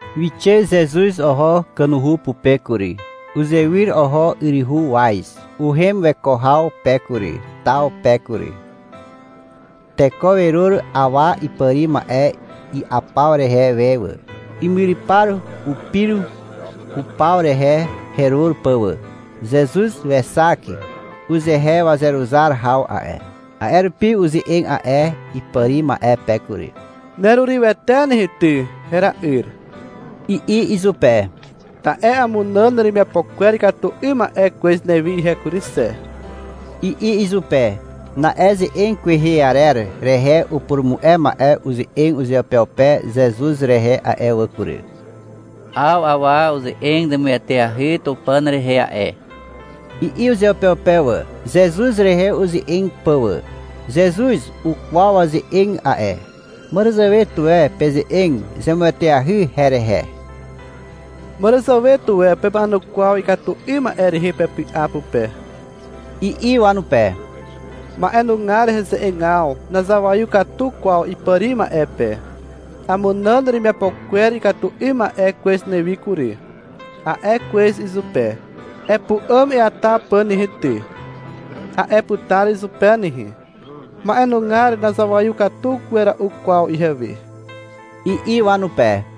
Wixe Zezuz oho kanuhu pupe kury. Uzewyr oho yryhu waz. Uhem weko haw pe kury, taw pe kury. Teko werur awa ipàri ma'e i'apaw rehe we wà. Imyrypar upir hupaw rehe herur pà wà. Zezuz wexak uzehe wazeruzar haw a'e. A'e rupi uze'eg a'e ipàri ma'e pe kury. — Nerurywete nehe ty, hera'yr, i'i izupe. — Ta'e amunàn neremiapo kwer ikatu 'ym ma'e kwez newi ihe kury xe, i'i izupe. Na'e ze'eg kwehe arer rehe upurumu'e ma'e uze'eg uzeupeupe Zezuz rehe a'e wà kury. — 'Aw awa uze'eg zemueteahy Tupàn rehe a'e, i'i uzeupeupe wà, Zezuz rehe uze'eg pà wà. Zezuz ukwaw waze'eg a'e. — Màràzàwe tuwe peze'eg zemueteahy herehe, màràzàwe tuwe pema'enukwaw ikatu 'ym ma'e rehe pepy'a pupe, i'i wanupe. — Ma'enugar heze'egaw nazawaiw katu kwaw ipàri ma'e pe. — Amunàn neremiapo kwer ikatu 'ym ma'e kwez newi kury, a'e kwez izupe. — Epu'àm eata pà nehe ty, a'e putar izupe nehe. Ma'enugar nazawaiw katu wera'u kwaw ihewe, i'i wanupe.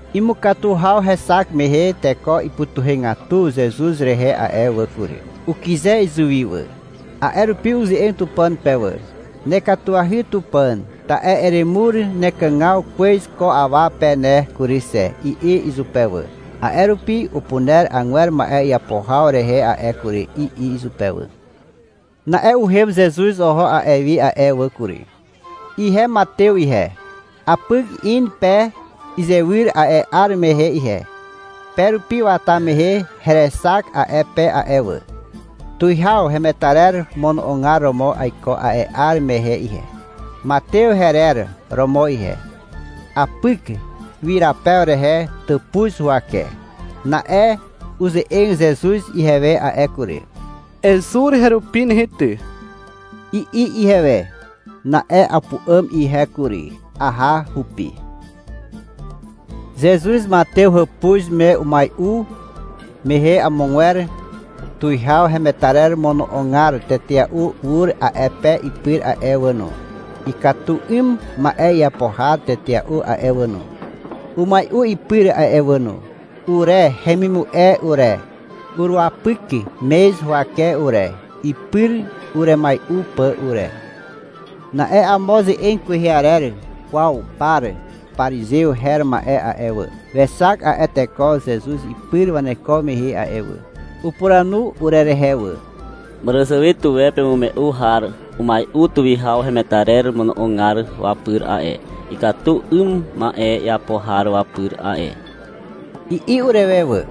Imukatu haw hexak mehe teko ipytuhegatu Zezuz rehe a'e wà kury. Ukyze izuwi wà. A'e rupi uze'eg Tupàn pe wà. — Nekatuahy Tupàn, ta'e eremur nekàgaw kwez ko awa pe ne kury xe, i'i izupe wà. — A'e rupi upuner agwer ma'e iapo haw rehe a'e kury, i'i izupe wà. Na'e uhem Zezuz oho a'e wi a'e wà kury. Ihe Matew ihe. Apyk in pe izywyr a'e 'ar mehe ihe. Pe rupi wata mehe herexak a'e pe a'e wà. Tuwihaw hemetarer mono'ogar romo aiko a'e 'ar mehe ihe. Matew herer romo ihe. Apyk ywyrapew rehe tàpuz huwake. Na'e uze'eg Zezuz ihewe a'e kury. — Ezur herupi nehe ty, i'i ihewe. Na'e apu'àm ihe kury. Aha hupi. Zezuz Matew hàpuz me umai'u mehe amogwer tuwihaw hemetarer mono'ogar tetea'u ur a'e pe ipyr a'e wà no. Ikatu 'ym ma'e iapo har tetea'u a'e wà no, umai'u ipyr a'e wà no. Ure hemimu'e ure, uruwapyk mez huwake ure, ipyr uremai'u pà ure. Na'e amo ze'eg kwehe arer kwaw par parizew her ma'e a'e wà, wexak a'e teko Zezuz ipyr waneko mehe a'e wà. Upuranu urerehe wà. — Màràzàwe tuwe pemu'e har umai'u tuwihaw hemetarer mono'ogar wapyr a'e, ikatu 'ym ma'e iapo har wapyr a'e, i'i urewe wà.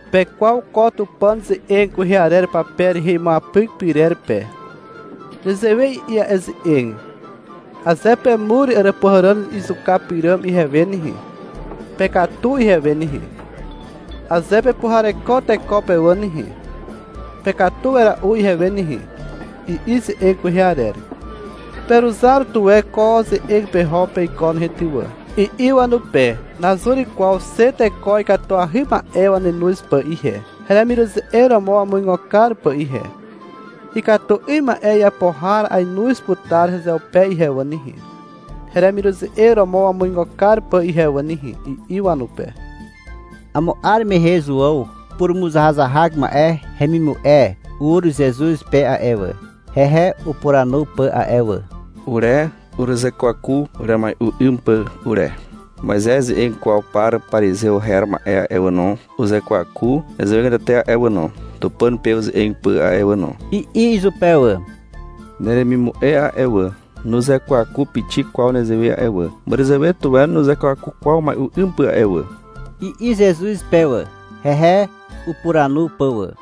— Pekwaw ko Tupàn ze'eg kwehe arer pape rehe imuapyk pyrer pe. Nezewe i'i a'e ze'eg. Aze pemur àràpuhàràn izuka pyràm ihewe nehe, pekatu ihewe nehe. Aze pepuhareko teko pe wà nehe, pekatu wera'u ihewe nehe, i'i ze'eg kwehe arer. — Peruzar tuwe ko ze'eg peho peiko nehe ty wà, i'i wanupe — Nazur kwaw xe teko ikatuahy ma'e wanenoz pà ihe, heremiruze'eg romo wamuigo kar pà ihe. Ikatu 'ym ma'e iapo har ainoz putar hezeupe ihe wà nehe, heremiruze'eg romo wamuigo kar pà ihe wà nehe, i'i wanupe. Amo 'ar mehe Zuàw purumuzahazahak ma'e hemimu'e ur Zezuz pe a'e wà, hehe upuranu pà a'e wà. — Ure uruzekwaku uremai'u 'ym pà ure. Moizez ze'eg kwaw par parizew her ma'e a'e wà no, uzekwaku nezewegatete a'e wà no, Tupàn pe uze'eg pà a'e wà no, i'i izupe wà. — Neremimu'e a'e wà, nuzekwaku pixik kwaw nezewe a'e wà. Màràzàwe tuwe nuzekwaku kwaw umai'u 'ym pà a'e wà, i'i Zezuz pe wà, hehe upuranu pà wà.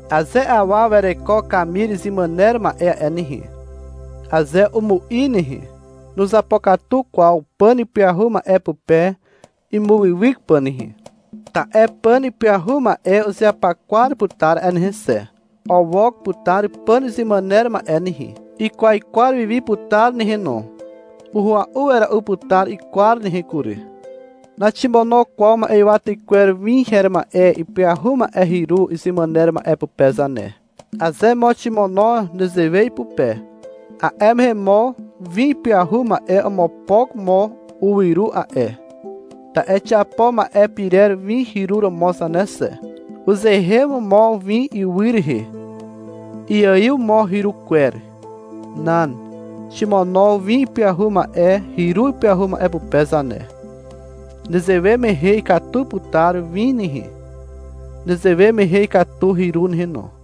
Aze awa wereko kamir izemàner ma'e a'e nehe, aze umu'i nehe, nuzapokatu kwaw pàn ipyahu ma'e pupe imuwywyk pà nehe, ta'e pàn ipyahu ma'e uzeapakwar putar a'e nehe xe. Owok putar pàn izemàner ma'e nehe. Ikwaikwar wi wi putar nehe no. Uhua'u wera'u putar ikwar nehe kury. Naximono kwaw ma'ywa tykwer win her ma'e ipyahu ma'e hyru izemàner ma'e pupe zane. Aze mo ximono nezewe ipupe, a'e mehe mo win ipyahu ma'e omopok mo uwyru a'e. (Ta'e xiapo ma'e pirer win hyru romo zane xe.) Uzeen mo win ywy rehe. Iaiw mo hyru kwer. Nan. Ximono win ipyahu ma'e hyru ipyahu ma'e pupe zane. Nezewe mehe ikatu putar win nehe. Nezewe mehe ikatu hyru nehe no.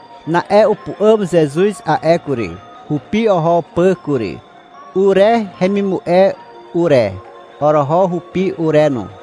Na'e upu'àm Zezuz a'e kury, hupi oho pà kury. Ure hemimu'e ure, oroho hupi ure no.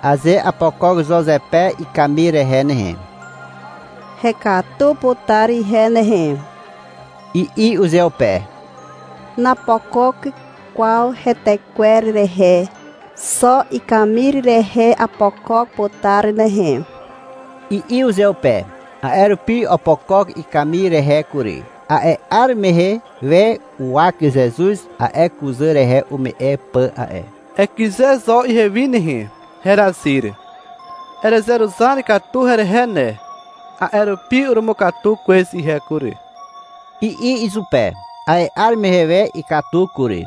— Aze apokok zo zepe ikamir rehe nehe, hekatu putar ihe nehe, i'i uzeupe. — Napokok kwaw hetekwer rehe. Xo ikamir rehe apokok putar nehe, i'i uzeupe. A'e rupi opokok ikamir rehe kury. A'e 'ar mehe we uwak Zezuz a'e kuzà rehe ume'e pà a'e. — Ekyze zo ihewi nehe herazyr. Erezeruzar katu herehe ne, a'e rupi urumukatu kwez ihe kury, i'i izupe. A'e 'ar mehe we ikatu kury.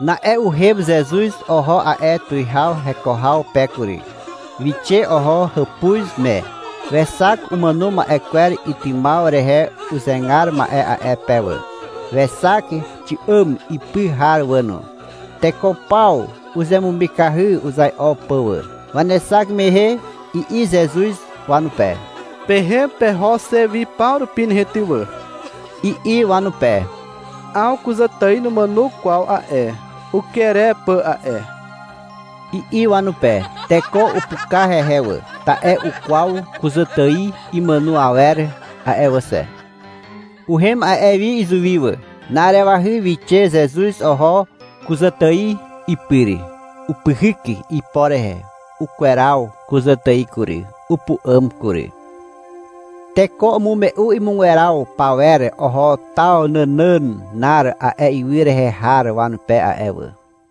Na'e uhem Zezuz oho a'e tuwihaw heko haw pe kury. Wixe oho hàpuz me. Wexak umàno ma'e kwer itymaw rehe uzegar ma'e a'e pe wà, wexak xi'àm ipy har wà no. Teko paw uzemumikahy uzai'o pà wà. Wanexak mehe i'i Zezuz wanupe. — Pehem peho xe wi paw rupi nehe ty wà, i'i wanupe. — 'Aw kuzàtài numàno kwaw a'e. Uker e pà a'e, i'i wanupe. Teko upuka hehe wà, (ta'e ukwaw kuzàtài imàno awer a'e wà xe.) Uhem a'e wi izuwi wà. Na'arewahy wixe Zezuz oho kuzàtài ipyr. Upyhyk ipo rehe. Ukweraw kuzàtài kury. Upu'àm kury. Teko umume'u imugweraw pawer oho taw nànànar a'e ywy rehe har wanupe a'e wà.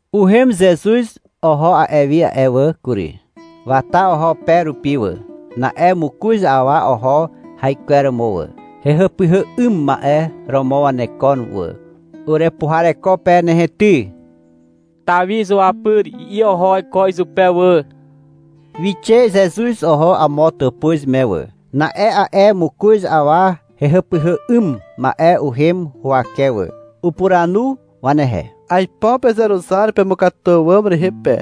Uhem Zezuz oho a'e wi a'e wà kury. Wata oho pe rupi wà. Na'e mokoz awa oho haikweromo wà. Hehàpyhà 'ym ma'e romo wanekon wà. — Urepuhareko pe nehe ty, Tawi izuapyr, i'i oho waiko izupe wà. Wixe Zezuz oho amo tàpuz me wà. Na'e a'e mokoz awa hehàpyhà 'ym ma'e uhem huwake wà. Upuranu wanehe. — Aipo pezeruzar pemukatu àwàm rehe pe,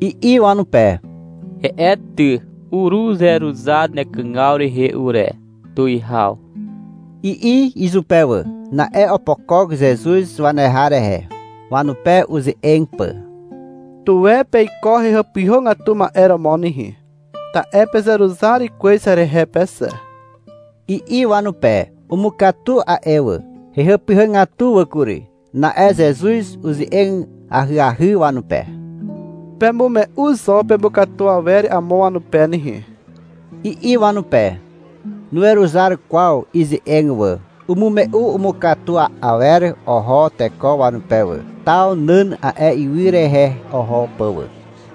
i'i wanupe. — He'e ty, uruzeruzar nekàgaw rehe ure, tuwihaw, i'i izupe wà. Na'e opokok Zezuz waneha rehe, wanupe uze'eg pà. — Tuwe peiko hehàpyhàgatu ma'e romo nehe, ta'e pezeruzar kwez herehe pe xe, i'i wanupe. Umukatu a'e wà. Hehàpyhàgatu wà kury. Na'e Zezuz uze'eg ahyahy wanupe. Pemume'u zo pemukatu awer amo wanupe nehe, i'i wanupe. Nuweruzar kwaw ize'eg wà. Umume'u umukatu awer oho teko wanupe wà, taw nàn a'e ywy rehe oho pà wà.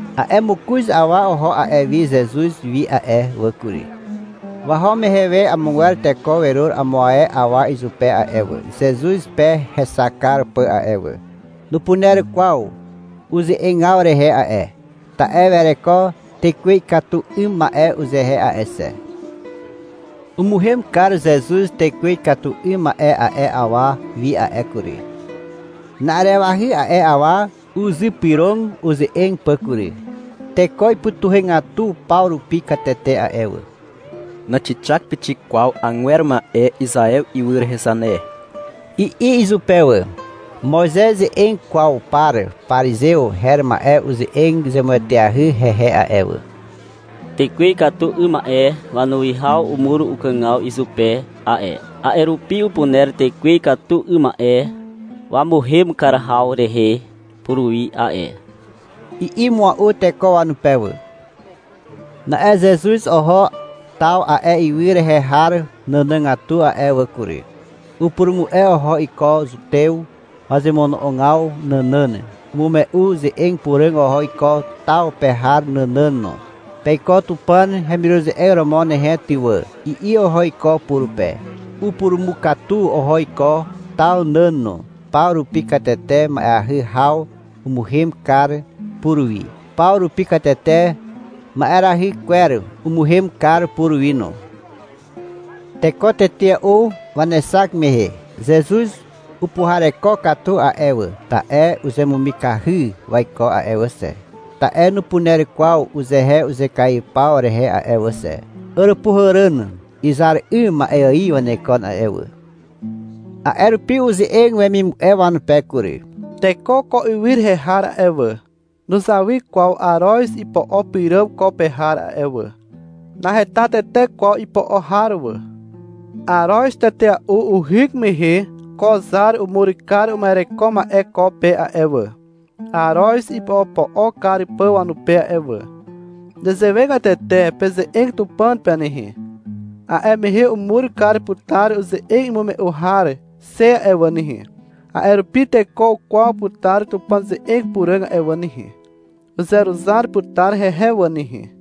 A'e mokoz awa oho a'e wi Zezuz wi a'e wà kury. Waho mehe we amogwer teko werur amo ae awa izupe a'e wà, Zezuz pe hexak kar pà a'e wà. Nupuner kwaw uze'egaw rehe a'e, ta'e wereko tekwe ikatu 'ym ma'e uzehe a'e xe. Umuhem kar Zezuz tekwe ikatu 'ym ma'e a'e awa wi a'e kury. Na'arewahy a'e awa uzypyrog uze'eg pà kury. Teko ipytuhegatu paw rupi katete a'e wà. — Naxixak pixik kwaw agwer ma'e Izaew ywy rehe zane, i'i izupe wà. Moizez ze'eg kwaw par parizew her ma'e uze'eg zemueteahy hehe a'e wà. — Tekwe ikatu 'ym ma'e wanuwihaw umur ukàgaw izupe a'e, a'e rupi upuner tekwe ikatu 'ym ma'e wamuhem kar haw rehe puruwi a'e, i'i mua'u teko wanupe wà. Na'e Zezuz oho taw a'e ywy rehe har nànàgatu a'e wà kury. Upurumu'e oho iko Zutew wazemono'ogaw nànàn. Umume'u ze'eg puràg oho iko taw pe har nànàn no. — Peiko Tupàn hemiruze'eg romo nehe ty wà, i'i oho iko purupe. Upurumukatu oho iko taw nàn no. Paw rupi katete ma'eahy haw umuhem kar puruwi. Paw rupi katete ma'erahy kwer umuhem kar puruwi no. Teko tetea'u wanexak mehe Zezuz upuhareko katu a'e wà. Ta'e uzemumikahy waiko a'e wà xe, ta'e nupuner kwaw uzehe uzekaiw paw rehe a'e wà xe. Àràpuhàràn izar 'ym ma'e ài wanekon a'e wà. A'e rupi uze'eg wemimu'e wanupe kury. — Teko ko ywy rehe har a'e wà, nuzawy kwaw aroz ipo'o pyràm ko pe har a'e wà. Naheta tete kwaw ipo'o har wà. Aroz tetea'u ihyk mehe ko zar umur kar uma'ereko ma'e ko pe a'e wà, aroz ipo'opo'o kar pà wanupe a'e wà. Nezewegatete peze'eg Tupàn pe nehe. A'e mehe umur kar putar uze'eg imume'u har xe a'e wà nehe. A'e rupi teko ukwaw putar Tupàn ze'eg puràg a'e wà nehe. Uzeruzar putar hehe wà nehe.